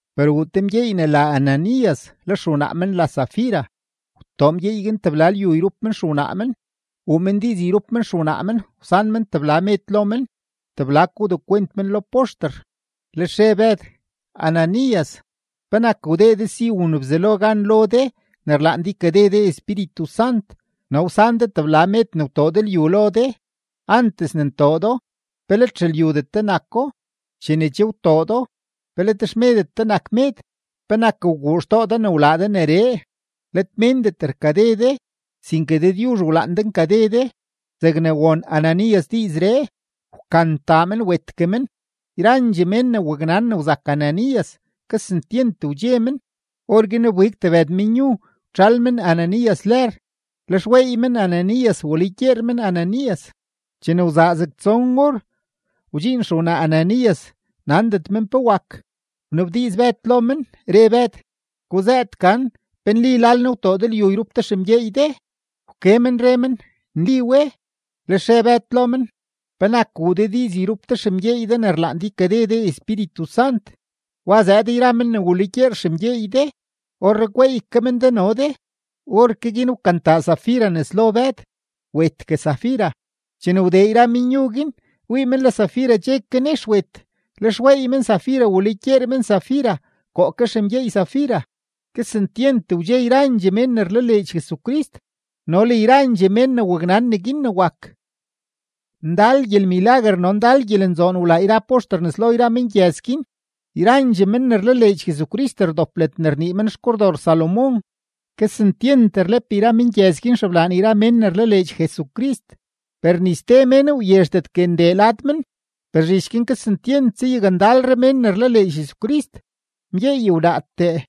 Per wuu te mgyeey ne la Ananías, le xewnaa men la Safira; wtoo mgyeey guin tebla lyu yrup men xewnaa men. Wuu men diiz yrup men xewnaa men wsan men tebla med lo men, tebla ko wdekwent men lo poxter. Lex re Bëd: ―Ananías, ¿penak wdee de si wun Bzelo gan lo de ne rlaan de ykade de Espíritu Sant no wsan de tebla med ne wtoo de lyu lo de? Antes ne ntoo do, ¿pe let xelyudet de nako? Chene che wtoo do, ¿pe let xmedet de nak med? ¿Penak wguu xtoo de wlaa de neree? Let méndet rkade de, sinke Dëdyuzh wlaan de nkade de. Zegne won Ananías diizree, wkantaa men wetgue men. Yrandxee mén ne waknan ne wzak Ananías, kesentyent wdxe men. Orguin wbig tebëd menyu, wtxël men Ananías lër, lex weey men Ananías walugyeer men Ananías. Chene wzaa zeg tson or, wdxiin xewnaa Ananías, nandet men pe wak. Wnabdiiz Bëd lo men, re Bëd: ―Guzëët gan ¿pe nli lal nee wtoo de lyu yrup de xemgyeey de? Wke men re men: ―Nli we. Lex re Bëd lo men: ―¿Penak wuu de diiz yrup de xemgyeey de ne rlaan de ykade de Espíritu Sant? Wa zëëd yra men ne walugyeer xemgyeey de; orree gweey ke men de no de. Orke guin wkantaa Safira nes lo Bëd, wetgue Safira. Chene wdee yra menyu guin, wii men le Safira che ke nex wet, lex weey men Safira walugyeer men Safira koo ke xemgyeey Safira. Kesentyent wdxe yrandxee mén ne rlaleedx Jesucrist no le yrandxee mén ne waknan neguin ne wak. Ndal gyelmilaguer no ndal gyelenzoon wlaa yra poxter nes lo yra mengyëz guin. Yrandxee men ne rlaleedx Jesucrist rdop ledne rnii men xKordor Salomón. Kesentyent rlep yra mengyëz guin xeblaan yra mén ne rlaleedx Jesucrist, per ni ste mén wyezhdetgue ndee lad men. Per zhich guin kesentyent zayakndalre mén ne rlaleedx Jesucrist, mgyeey wnaatee,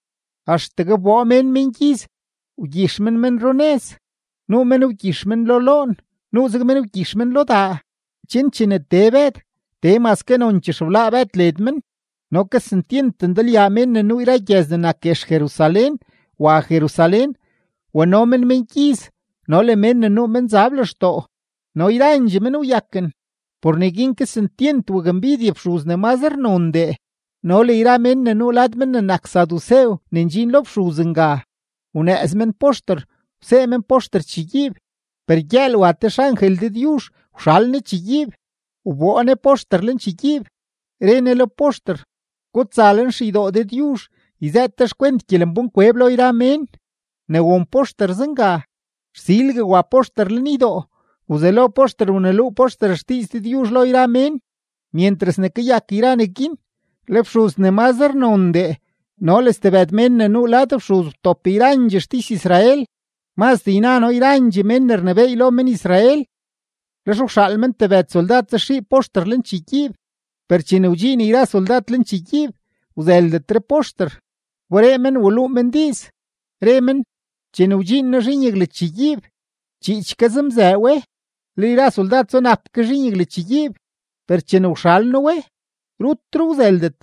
axtegue wboo mén mengyiz, wgyix men men runëz; nuu men wgyix men lo loon, nuuzeg men wgyix men lo daa, chen chene tee Bëd, tee maske nonchee xeblaa Bëd led men. No kesentyent ndalyaa mén ne nuu yra gyëz ne nak guex Jerusalén wa Jerusalén wano men mengyiz no le mén ne nuu menzab lextoo, no yrandxee men wyaken. Por neguin kesentyent wakmbidye fxuz ne mazre nondee no le yra mén ne nuu lad men ne nak sadusew ne ndxin lo fxuz nga. Wnëëz men poxter, wsee men poxter chegyiib. Per gyëël wa te xangel Dëdyuzh wxal ne chegyiib, wboo ne poxter lenchegyiib, re ne lo poxter: ―Gutsa lenxeydoo Dëdyuzh yzëët de xkwent gyelembánkweb lo yra mén. Ne won poxter zenga, rsilgue wa poxter lenydoo, wzelo poxter wneluu poxter xdiiz Dëdyuzh lo yra mén. Myentras ne kayak yra neguin, le fxuz ne mazre nondee no le stebëd mén ne nuu lad fxuz wtop yrandxee xtis-Israel, mazdee yna noo yrandxee men ne rnebééy lo men-Israel. Lex wxaal men tebëd soldad zaxii poxter lenchegyiib. Per chene wdxiin yra soldad lenchegyiib, wzëldetre poxter; wberee men wluu men diiz, re men: ―Chene wdxiin noo zhiin yaglachegyiib, chiich ke zemzëë we, le yra soldad zunap ke zhiin yaglachegyiib; per chene wxal noo we, rutre wzëldet.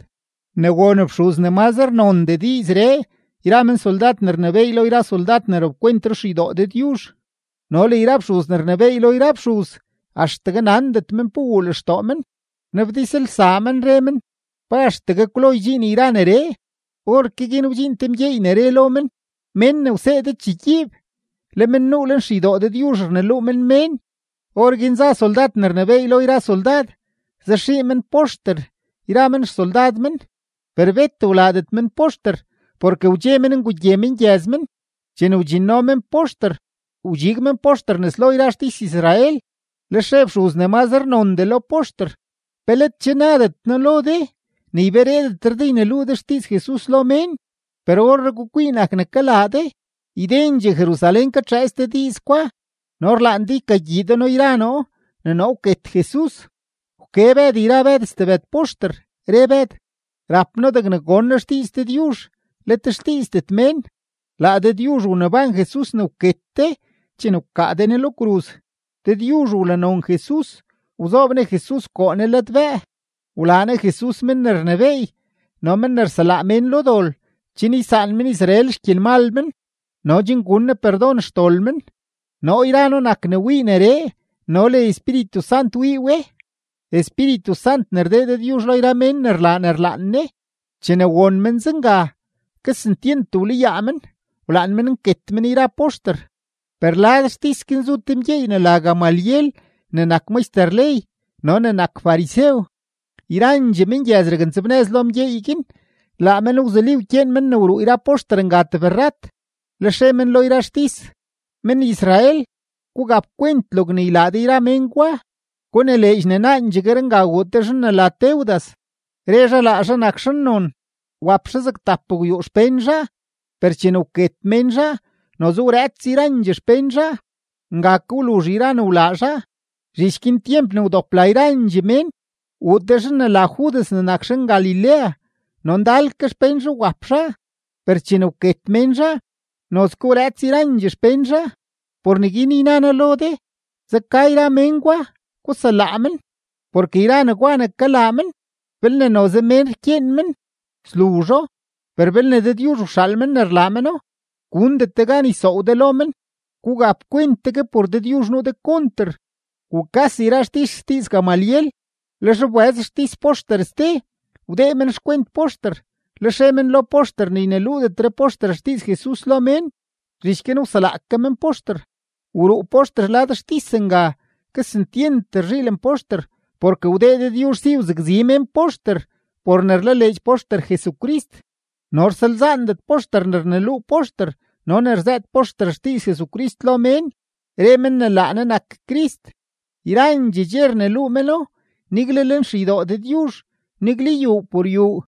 Ne won fxuz ne mazre nondee diizree yra men soldad ne rnebééy lo yra soldad ne rapkwent ruxeydoo Dëdyuzh no le yra men fxuz ne rnebééy lo yra fxuz, axtegue nandet men pe wuu lextoo men, rnabdizlsaa men, re men: “¿Pa axtegue kwlo ydxiin yra neree?” Orke guin wdxiin te mgyeey ne re lo men: ―Mén ne wsee de chegyiib, le men nuu lenxeydoo Dëdyuzh rneluu men mén. Orguin za soldad ne rnebééy lo yra soldad, zaxii men poxter yra men xsoldad men; per bet wlaadet men poxter porke wdxe men ngugye mengyëz men. Chene wdxinno men poxter, wdxig men poxter nes lo yra xtis-Israel. Lex re fxuz ne mazre nondee lo poxter: ―¿Pe let che nadet noo lo de ne ybereedetre de ne yneluu de xdiiz Jesus lo mén? Per orree gukwii nak ne kalaa de, ydendxee Jerusalén katxëëts de diiz gwa no rlaan de ykagyii de noo yra noo ne noo wket Jesus. Wke Bëd yra Bëd stebëd poxter, re Bëd: ―Rap noo degne gon noo xdiiz Dëdyuzh, let xdiizdet mén. Laa Dëdyuzh wneban Jesus ne wket de chene wkaa de Ne lo kruz. Dëdyuzh wlanon Jesus, wzoob Ne Jesus koo Ne ladbëë, wlaa Ne Jesus men ne rnebééy no men ne rselaa mén lo dol chen ysaan men-Israel xgyelmal men no chen gun Ne perdon xdol men. Noo yra noo nak ne wii neree no le Espíritu Sant wii we, Espíritu Sant ne rdee Dëdyuzh lo yra mén ne rlaa ne rlaan Ne. Chene won men zenga, kesentyent wlayaa men, wlaan men nket men yra poxter. Per lad xtis guin zu te mgyeey ne la Gamaliel ne nak maxter ley no ne nak farisew. Yrandxee mengyëz raknzebnëz lo mgyeey guin; laa men wzuli wkyeen men wruu yra poxter nga tebrrat. Lex re men lo yra xtis: ―Men-Israel, gugap kwent logne ylaa de yra mén gwa. Gunileedx ne naandxeree wuu te zhan ne la Teudas, re zhaa laa zhaa nak zhannon, wap zhaa zeg tapgwyuu xpén zhaa. Per chene wket mén zhaa, noze wrëëts yrandxee xpén zhaa; nga ke wluzh yra ne wlaa zhaa. Zhich guin, tyemp ne wdop la yrandxee mén, wuu te zhan ne la Judas ne nak zhan-Galilea, no ndal ke xpén zhaa wap zhaa, per chene wket mén zhaa, nozke wrëëts yrandxee xpén zhaa. Por neguin yna noo lo de, zeka yra mén gwa, guselaa men. Porke yra negwa ne kalaa men, belne noze mén rkyeen men, sluzho. Per belne Dëdyuzh wxaal men ne rlaa meno, gundet de gan ysoow de lo men. Gugap kwent tegue por Dëdyuzh nuu de konter. Wukas yra xtis xdiiz Gamaliel. Lex wbëz xtis poxter ste, wdee men xkwent poxter, lex re men lo poxter ne yneluudetre poxter xdiiz Jesus lo mén; zhich guin wselaa ke men poxter. Wruu poxter lad xtis nga, kesentyent rzhiilen poxter porke wdee Dëdyuzh si wzakzi mén poxter por ne rlaleedx poxter Jesucrist. No rsalzaandet poxter ne rneluu poxter no ne rzëët poxter xdiiz Jesus lo mén, re men ne laa Ne nak Crist. Yrandxee dxe rneluu meno nigle lenxeydoo Dëdyuzh, nigle yuu por yuu.